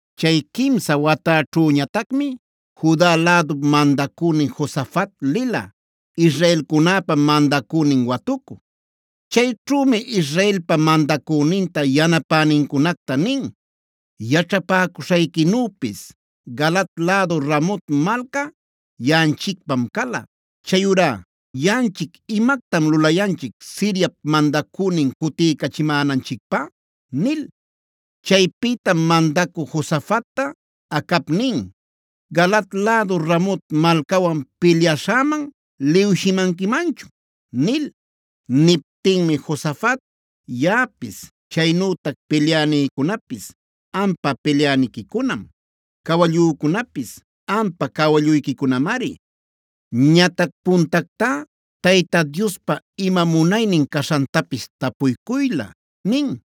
Chay quimsa watäćhüñatacmi Juda lädup mandacünin Josafat lila, israelcunäpa mandacünin watucü. Chayćhümi Israelpa mandacüninta yanapänincunacta nin: “Yaćhapäcuśhayquinüpis Galaad lädu Ramot malca yaꞌanchicpam cala. Chayurá ¿yaꞌanchic imactam lulayanchic Siriap mandacünin cutiycachimänanchicpä?” nil. Chaypïtam mandacü Josafatta Acab nin: “¿Galaad lädu Ramot malcawan pilyaśhäman liwshimanquimanchun?” nil. Niptinmi Josafat: “Yaꞌapis, chaynütac pilyänïcunapis ampa pilyäniquicunam; cawallücunapis ampa cawalluyquicunamari. Ñatac puntactá Tayta Diospa ima munaynin caśhantapis tapuycuylä” nin.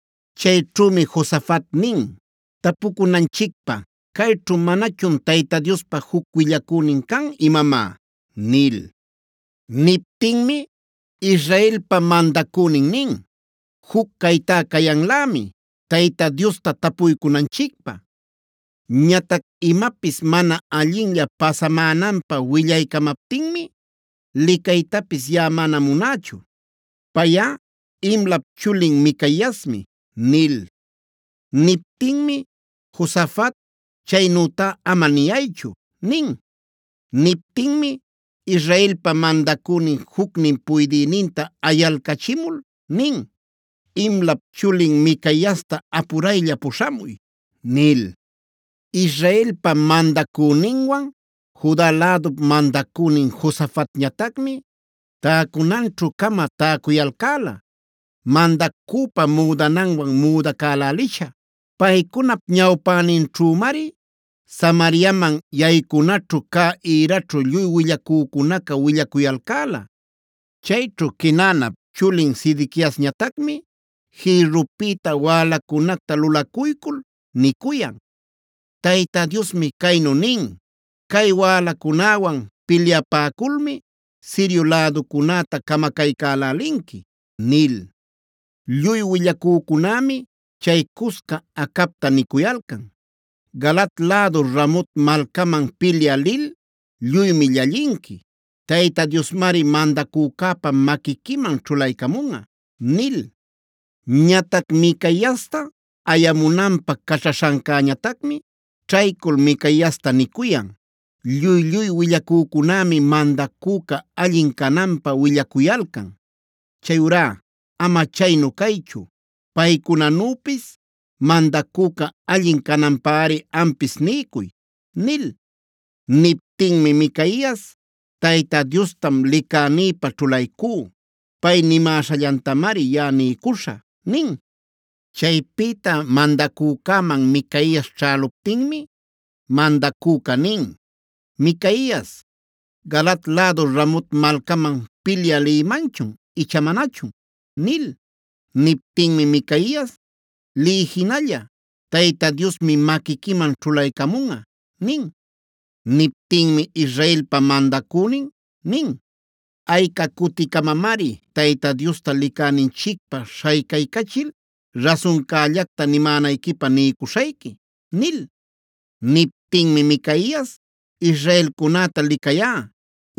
Chayćhümi Josafat nin: “¿Tapucunanchicpä, cayćhu manachun Tayta Diospa juc willacünin can imamá?” nil. Niptinmi Israelpa mandacünin nin: “Juc caytá cayanlämi Tayta Diosta tapuycunanchicpä. Ñatac imapis mana allinlla pasamänanpä willaycamaptinmi licaytapis yaꞌa mana munächu. Payꞌa Imlap chulin Micaiasmi” nil. Niptinmi Josafat: “Chaynütá ama niyaychu” nin. Niptinmi Israelpa mandacünin jucnin puydïninta ayalcachimul nin: “Imlap chulin Micaiasta apuraylla puśhamuy” nil. Israelpa mandacüninwan Juda lädup mandacünin Josafatñatacmi täcunanćhu-cama täcuyalcäla mandacüpa müdananwan müdacälälisha. Paycunap ñawpäninćhümari Samariaman yaycunaćhu cä ïraćhu lluy willacücunaca willacuyalcäla. Chayćhu Quenaanap chulin Sedequiasñatacmi jïrrupïta wälacunacta lulacuycul nicuyan: “Tayta Diosmi caynu nin: ‘Cay wälacunäwan pilyapäculmi Sirio läducunäta camacaycälälinqui’” nil. Lluy willacücunämi chay cusca Acabta nicuyalcan: “Galaad lädu Ramot malcaman pilyä lil lluymi llallinqui. Tayta Diosmari mandacücäpa maquiquiman ćhulaycamunꞌa” nil. Ñatac Micaiasta ayamunanpä caćhaśhancäñatacmi ćhaycul Micaiasta nicuyan: “Lluy-lluy willacücunämi mandacüca allin cananpä willacuyalcan. Chayurá ama chaynu caychu paycunanüpis mandacüca allin cananpäri ampis niycuy” nil. Niptinmi Micaias: “Tayta Diostam licänïpä ćhulaycú. Pay nimäśhallantamari yaꞌa niycuśhä” nin. Chaypïta mandacücäman Micaias ćhäluptinmi mandacüca nin: “Micaias, ¿Galaad lädu Ramot malcaman pilyä lïmanchun icha manachun?” nil. Niptinmi Micaias: “Liy jinalla; Tayta Diosmi maquiquiman ćhulaycamunꞌa” nin. Niptinmi Israelpa mandacünin nin: “¿Ayca cuticamamari Tayta Diosta licäninchicpä śhaycaycachil rasuncällacta nimänayquipä niycuśhayqui?” nil. Niptinmi Micaias: “Israelcunäta licayá,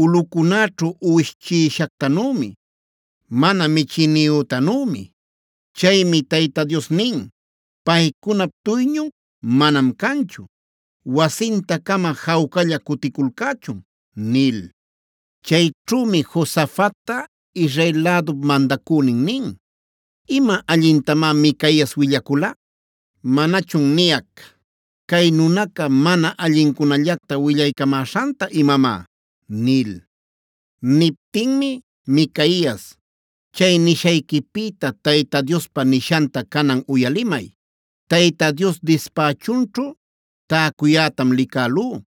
ulꞌucunäćhu uwish chiꞌishactanümi, mana michïniyütanümi.b Chaymi Tayta Dios nin: ‘Paycunap duyñun manam canchu. Wasinta-cama jawcalla cuticulcächun’” nil. Chayćhümi Josafatta Israel lädup mandacünin nin: “Ima allintamá Micaias willacula. ¿Manachun niyac, cay nunaca mana allincunallacta willaycamäśhanta imamá?” nil. Niptinmi Micaias: “Chay nishayquipïta Tayta Diospa nishanta canan uyalimay. Tayta Dios dispächunćhu täcuyätam licälú.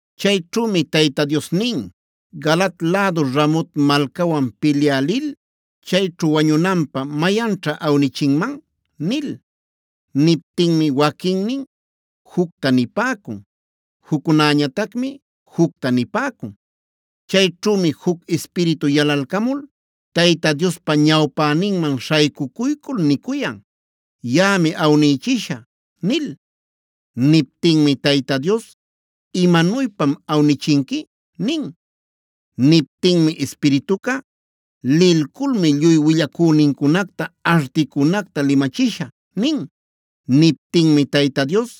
Chayćhümi Tayta Dios nin: ‘¿Galaad lädu Ramot malcawan pilyä lil chayćhu wañunanpä mayanćha awnichinman?’ nil. Niptinmi waquinnin jucta nipäcun; juccunäñatacmi jucta nipäcun. Chayćhümi juc ispiritu yalalcamul Tayta Diospa ñawpäninman śhaycucuycul nicuyan: ‘Yaꞌami awnïchishä’ nil. Niptinmi Tayta Dios: ‘¿Imanuypam awnichinqui?’ nin. Niptinmi ispirituca: ‘Lilculmi lluy willacünincunacta articunacta limachishä’ nin. Niptinmi Tayta Dios: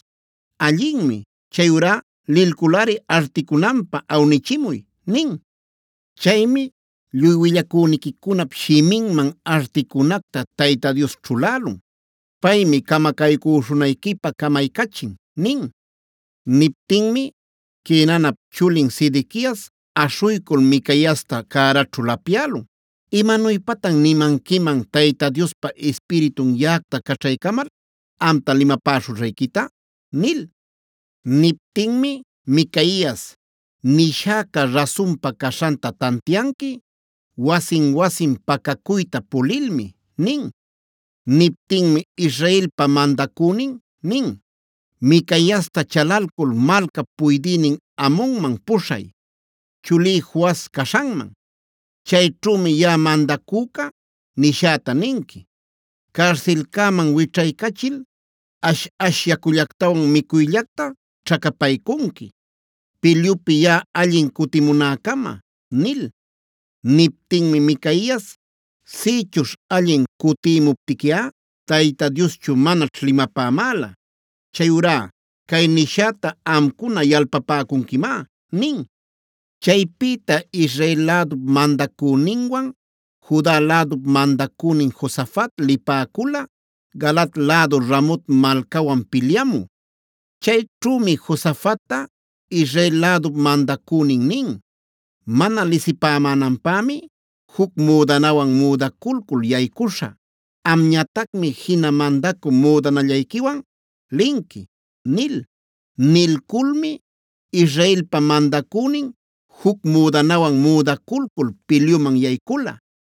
‘Allinmi, chayurá lilculꞌari articunanpä awnichimuy’ nin. Chaymi lluy willacüniquicunap shiminman articunacta Tayta Dios ćhulälun. Paymi camacaycüśhunayquipä camaycachin” nin. Niptinmi Quenaanap chulin Sedequias aśhuycul Micaiasta cäraćhu lapyälun: “¿Imanuypatan nimanquiman Tayta Diospa ispiritun yaꞌacta caćhaycamal amta limapäśhuśhayquita?” nil. Niptinmi Micaias: “Nishäca rasunpa caśhanta tantianqui wasin-wasin pacacuyta pulilmi” nin. Niptinmi Israelpa mandacünin nin: “¡Micaiasta chalalcul malcap puydïnin Amonman puśhay, chulí Joas caśhanman! Chayćhümi yaꞌa mandacüca nishäta ninqui: ‘Carsilcäman wićhaycachil ash-ash yacullactawan micuyllacta ćhacapaycunqui, pilyupi yaꞌa allin cutimunäcama’” nil. Niptinmi Micaias: “Sïchuśh allin cutïmuptiquiꞌa Tayta Dioschu manaćh limapämäla. Chayurá cay nishäta amcuna yalpapäcunquimá” nin. Chaypïta Israel lädup mandacüninwan Juda lädup mandacünin Josafat lipäcula Galaad lädu Ramot malcawan pilyamü. Chayćhümi Josafatta Israel lädup mandacünin nin: “Mana lisipämänanpämi juc müdanawan müdaculcul yaycuśhä; amñatacmi jina mandacü müdanallayquiwan linqui” nil. Nilculmi Israelpa mandacünin juc müdanawan müdaculcul pilyuman yaycula.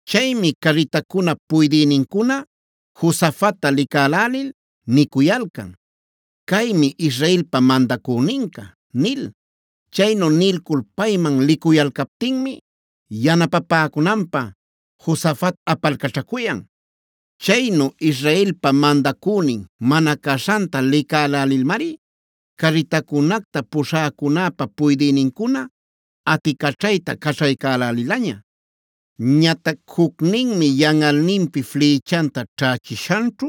Chaymi carritacunap puydïnincuna Josafatta licälälil nicuyalcan: “Caymi Israelpa mandacüninca” nil. Chaynu nilcul payman licuyalcaptinmi yanapapäcunanpä Josafat apalcaćhacuyan. Chaynu Israelpa mandacünin mana caśhanta licälälilmari carritacunacta puśhäcunäpa puydïnincuna aticaćhayta caćhaycälälilaña. Ñatac jucninmi yanꞌalninpi flïchanta ćhächishanćhu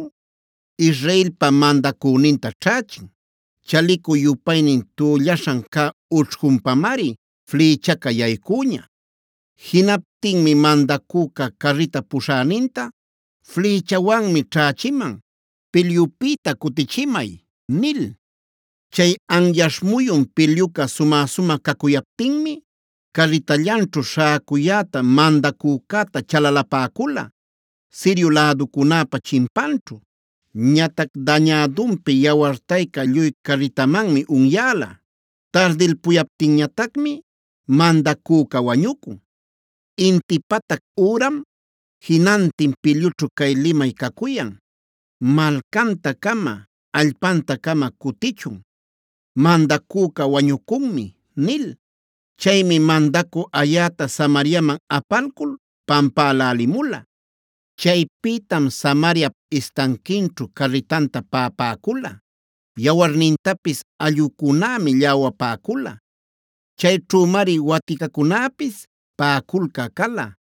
Israelpa mandacüninta ćhächin. Chalicu-yupaynin tüllaśhan cä ućhcunpamari flïchaca yaycüña. Jinaptinmi mandacüca carrita puśhäninta: “Flïchawanmi ćhächiman; pilyupïta cutichimay” nil. Chay anyaśh muyun pilyuca sumä-sumä cacuyaptinmi carritallanćhu śhäcuyäta mandacücäta chalalapäcula, Sirio läducunäpä chimpanćhu. Ñatac dañädunpi yawartayca lluy carritamanmi unyäla; tardilpuyaptinñatacmi mandacüca wañucun. Inti patac üram jinantin pilyućhu cay limay cacuyan: “¡Malcanta-cama, allpanta-cama cutichun! ¡Mandacüca wañucunmi!” nil. Chaymi mandacü ayäta Samariaman apalcul pampälälimula. Chaypïtam Samariap istanquinćhu carritanta paꞌapäcula; yawarnintapis allꞌucunämi lläwapäcula. Chayćhümari waticacunäpis paꞌaculcä cala.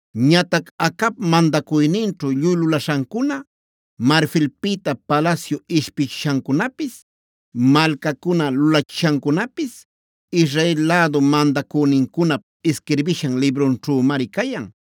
Ñatac Acab mandacuyninćhu lluy lulaśhancuna, marfilpïta palasyu ishpichishancunapis, malcacuna lulachishancunapis Israel lädu mandacünincunap isquirbishan librunćhümri cayan.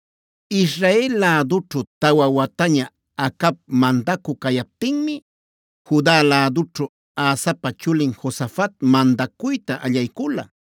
Israel lädućhu tawa wataña Acab mandacü cayaptinmi Juda lädućhu Asapa chulin Josafat mandacuyta allaycula.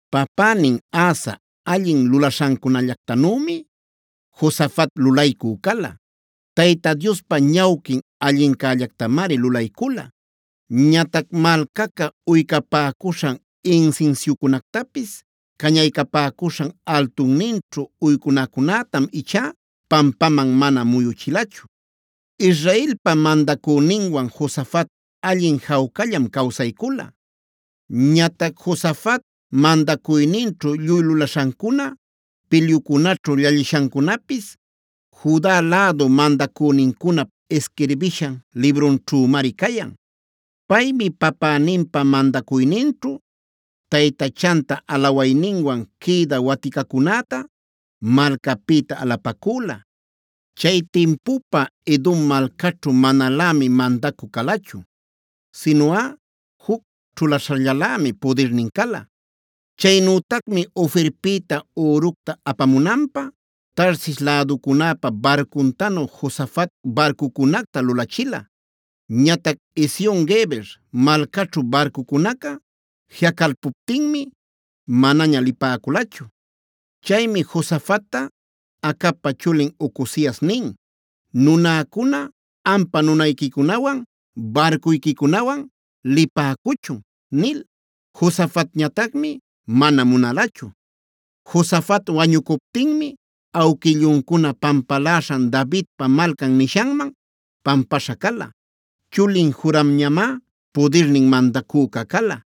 Papänin Asa allin lulaśhancunallactanümi Josafat lulaycü cala. Tayta Diospa ñawquin allincällactamari lulaycula. Ñatac malcaca uycapäcuśhan, insinsiucunactapis cañaycapäcuśhan altunninćhu uycunacunätam ichá pampaman mana muyuchilachu. Israelpa mandacüninwan Josafat allin jawcallam cawsaycula. Ñatac Josafat mandacuyninćhu lluy lulaśhancuna, pilyucunaćhu llallishancunapis Juda lädu mandacünincunap isquirbishan librunćhümari cayan. Paymi papäninpa mandacuyninćhu taytachanta alawayninwan quïda waticacücunäta malcapïta alapacüla. Chay timpupa Edom malcaćhu manalämi mandacü calachu; sinuꞌa juc ćhulaśhallalämi pudirnin cala. Chaynütacmi Ofirpïta üructa apamunanpä Tarsis läducunäpa barcuntanu Josafat barcucunacta lulachila. Ñatac Ezion-geber malcaćhu barcucunaca jiꞌacalpuptinmi manaña lipäculachu. Chaymi Josafatta Acabpa chulin Ocozias nin: “Nunäcuna ampa nunayquicunawan barcuyquicunawan lipäcuchun” nil. Josafatñatacmi mana munalachu. Josafat wañucuptinmi awquilluncuna pampaläśhan Davidpa Malcan nishanman pampaśha cala. Chulin Joramñamá pudirnin mandacüca cala.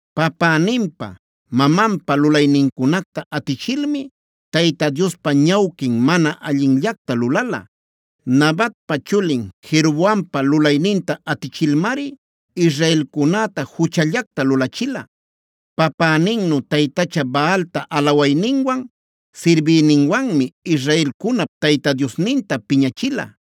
Papäninpa, mamanpa lulaynincunacta atichilmi Tayta Diospa ñawquin mana allinllacta lulala. Nabatpa chulin Jeroboampa lulayninta atichilmari israelcunäta juchallacta lulachila. Papäninnu taytacha Baalta alawayninwan, sirbiyninwanmi Israelcunap Tayta Diosninta piñachila.